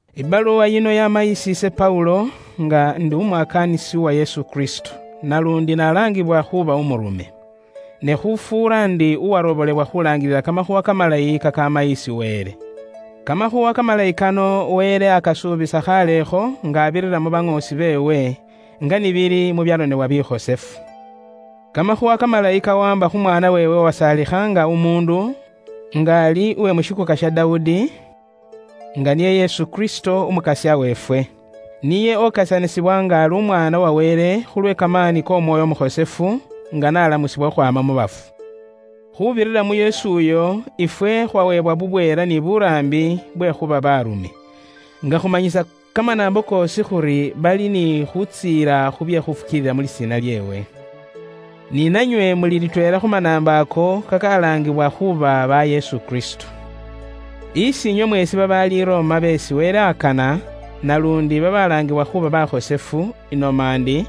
Ibaluwa yino yaama isi ise Paulo, nga ndi umwakaanisi uwa Yesu Kristo, naluundi naalangibwa khuuba umurume. Ne khufuura ndi uwarobolebwa khuulaangilila Kamakhuuwa Kamalayi kakaama isi Wele. Kamakhuuwa Kamalayi kano Wele aakasuubisa khaalekho nga abirira mu baŋoosi beewe, nga ni bili mu byaronebwa bikhosefu. Kamakhuuwa kamalayi kawaamba khu mwaana weewe uwasaalikha nga umuundu, nga ali uwe mu shikuuka sha Dawudi, nga niye Yesu Kristo, Umukasya weefwe. Niye okesanisibwa nga ali Umwaana wa Wele khulwe kamaani k'Omwoyo Umukhosefu, nga n'alamusibwa khukhwaama mu bafu. Khuubirira mu Yesu uyo, ifwe khwaweebwa bubweela ni buraambi bwe khuuba baarume, nga khumanyisa kamanaambo koosi khuri bari ni khutsiila khu bye khufukiilila mu lisiina lyeewe. Ni nanywe muli litweela khu manaambo ako, kakalaangibwa khuuba ba Yesu Kristo. Isi inywe mweesi babaali i Roma beesi Wele akana, naluundi babalaangibwa khuuba bakhosefu, inoma indi,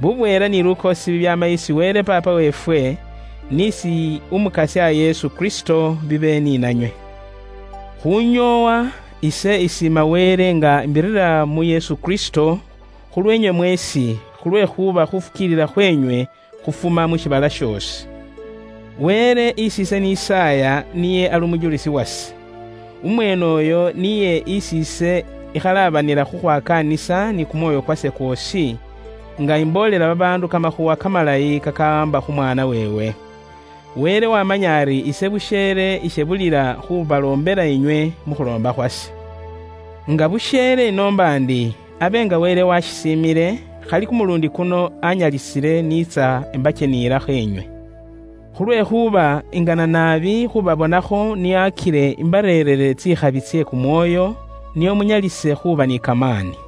bubweela ni lukoosi bibyaama isi Wele Paapa weefwe, ni isi Umukasya Yesu Kristo, bibe ni nanywe. Khunyoowa, ise isiima Wele nga imbirira mu Yesu Kristo, khulweenywe mweesi, khulwekhuuba khuufukiilila khweenywe khufuma mu shiibala shoosi. Wele isi ise nisaaya niye ali umujulisi wase. Umweene uyo niye isi ise ikhalaabanila khukhwakaanisa ni kumwoyo kwase kwoosi nga imboolela babaandu Kamakhuuwa Kamalayi kakawaamba khu mwaana weewe. Wele wamanya ari ise busheele ishebulila khubaloombela inywe mu khuloomba khwase. Nga busheele ise inoomba ndi abe nga Wele washisiimile, khali kumuluundi kuno anyalisile ise niitsa imbakyeniyilakho inywe. Khulwekhuuba ingana naabi khuubabonakho nio akile imbareerere tsikhabi tse kumwoyo, nio munyalise khuuba ni kamaani.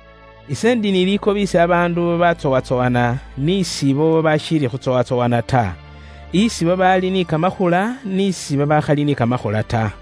Ise indi busa nga uuli ni likobi isi babaandu babatsowatsowana ni isi banaambo; isi babaali ni kamakhula ni isi babaakhali ni kamakhula ta.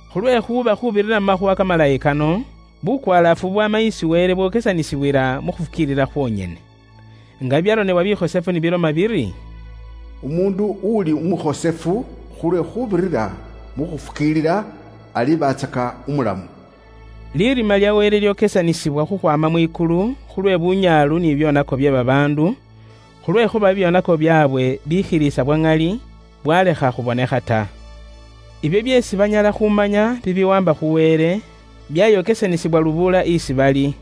Khulwekhuuba khuubirira mu Makhuwa Kamalayi kano, bukwalaafu bubwaama isi Wele bwokesanisibwila mu khufukiilila khwonyene. Nga bibyaronebwa bikhosefu ni biloma biri, “Umuundu uli umukhosefu khulwe khuubirira mu khufukiilila, alibatsaka umulamu.” Lirima lya Wele lyokesanisibwa khukhwaama mwikulu khulwe bunyaalu ni bibyoonako bye babaandu, khulwekhuuba bubwoonaki bwaabwe bwikhilisa bwa ŋali, bwalekha khubonekha ta. Ibyo byeesi banyala khumanya bibiwaamba khu Wele, byayokesanisibwa lubuula isi bali.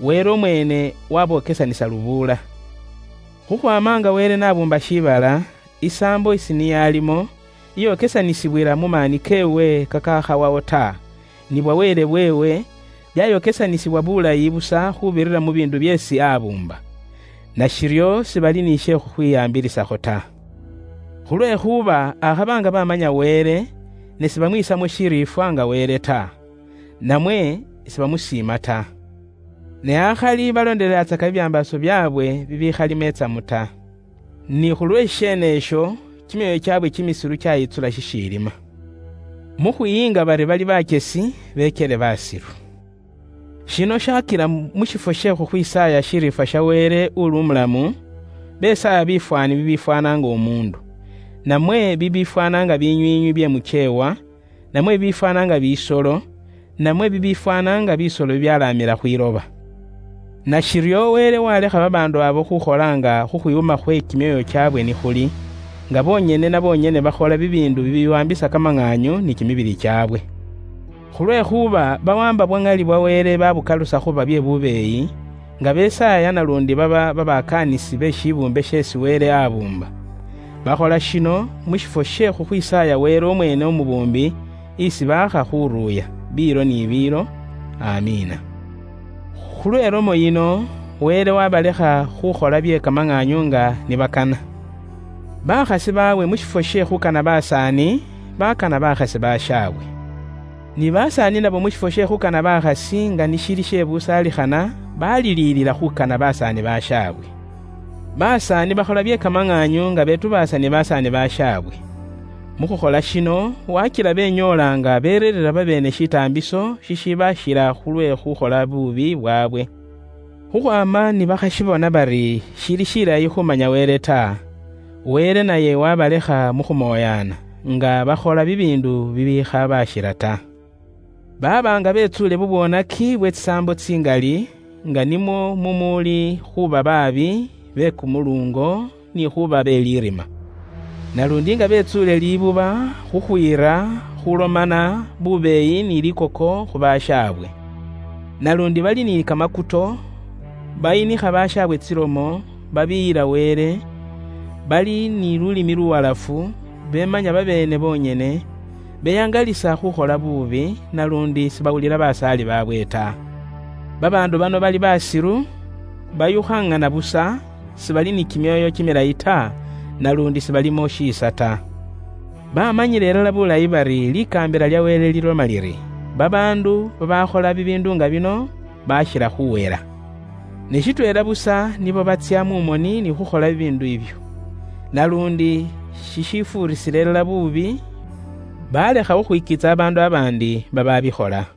Wele umweene wabokesanisa lubuula. Khukhwaama nga Wele n'abuumba shiibala, isaambo isi niye alimo, iyokesanisibwila mu maani keewe kakakhawawo ta, ni bwa Wele bweewe, byayokesanisibwa bulayi busa khuubirira mu biindu byeesi abuumba. Nashiryo sibali ni she khukhwihaambilisakho ta. Khulwekhuuba akhaba nga bamanya Wele, ne sibamwisamo shiriifwa nga Wele ta. Namwe sibamusiima ta. Ne akhali baloondelelatsaka bibyambaaso byaabwe bibikhalimo itsamu ta. Ni khulwe shisheene isho, kimyoyo kyaabwe kimisilu kyayitsula shishiilima. Mu khwiyinga bari bali bakyesi, bekyele basilu. Shino shakila mu shifwo she khukhwisaaya shiriifwa sha Wele uliwo biilo ni biilo, besaaya bifwaani bibiifwaana nga umuundu, namwe bibiifwaana nga binywiinywi bye mukyeewa, namwe bibiifwaana nga bisolo, namwe bibiifwaana nga bisolo bibyalaamila khwiloba. Nashiryo Wele waalekha babaandu abo khuukhola nga khukhwikoomba khwe kimyoyo kyaabwe ni khuli, nga bonyene na bonyene bakhola bibiindu bibiwaambisa kimibili kyaabwe bunyaalu. Khulwekhuuba bawaamba bwa ŋali bwa Wele baabukalusa khuuba bye bubeeyi, nga besaaya naluundi baaba babakaanisi be shibuumbe sheesi Wele aabuumba. Bakhola shino, mu shifwo she khukhwisaaya Wele umweene umubuumbi, isi baakha khuruuya, biilo ni biilo. Amiina. Khulwe ilomo yino, Wele waabalekha khuukhola bye kamaŋaanyu nga ni bakana. Bakhasi baabwe mu shifwo she khuukana basaani, bakana bakhasi bashaabwe. Ni basaani nabo mu shifwo she khuukana bakhasi nga ni shili she busaalikhana, baliliilila khuukana basaani bashaabwe. Basaani bakhola bye kamaŋaanyu nga betubaasa ni basaani bashaabwe. Mu khukhola shino, wakila benyoola nga bereereera babeene shitaambiso shishibashila khulwe khukhola buubi khwaabwe. Khukhwaama ni bakhashibona bari shili shilayi khumanya Wele ta, Wele naye wabalekha mu khumooyana, nga bakhola bibiindu bibikhabashila ta. Baaba nga betsuule bubwoonaki bwe tsisaambo tsingali, nga nimwo mumuuli khuuba baabi, be kumuluungo, ni khuuba be lirima. Naluundi nga betsuule libuba, khukhwiira, khuulomana, bubeeyi ni likoko khu bashaabwe. Naluundi bali ni kamakuto, bayinikha bashaabwe tsilomo, babiiyila Wele, bali ni lulimi luwalafu, beemanya babeene bonyene, beyaangalisa khukhola buubi, naluundi sibawulila basaali baabwe ta. Babaandu bano bali baasilu, bayukhaŋana busa, sibali ni kimyoyo kimilayi ta, naluundi sibalimo shiisa ta. Bamanyila ilala bulayi bari likaambila lya Wele liloma liri, babaandu babaakhola bibiindu nga bino baakhila khuuhela. Ne shitweela busa nibo batsya mu moni ni khuukhola bibiindu ibyo. Naluundi shishifuurisila ilala buubi, baalekha khukhwikiitsa babaandu babaandi babaabikhola.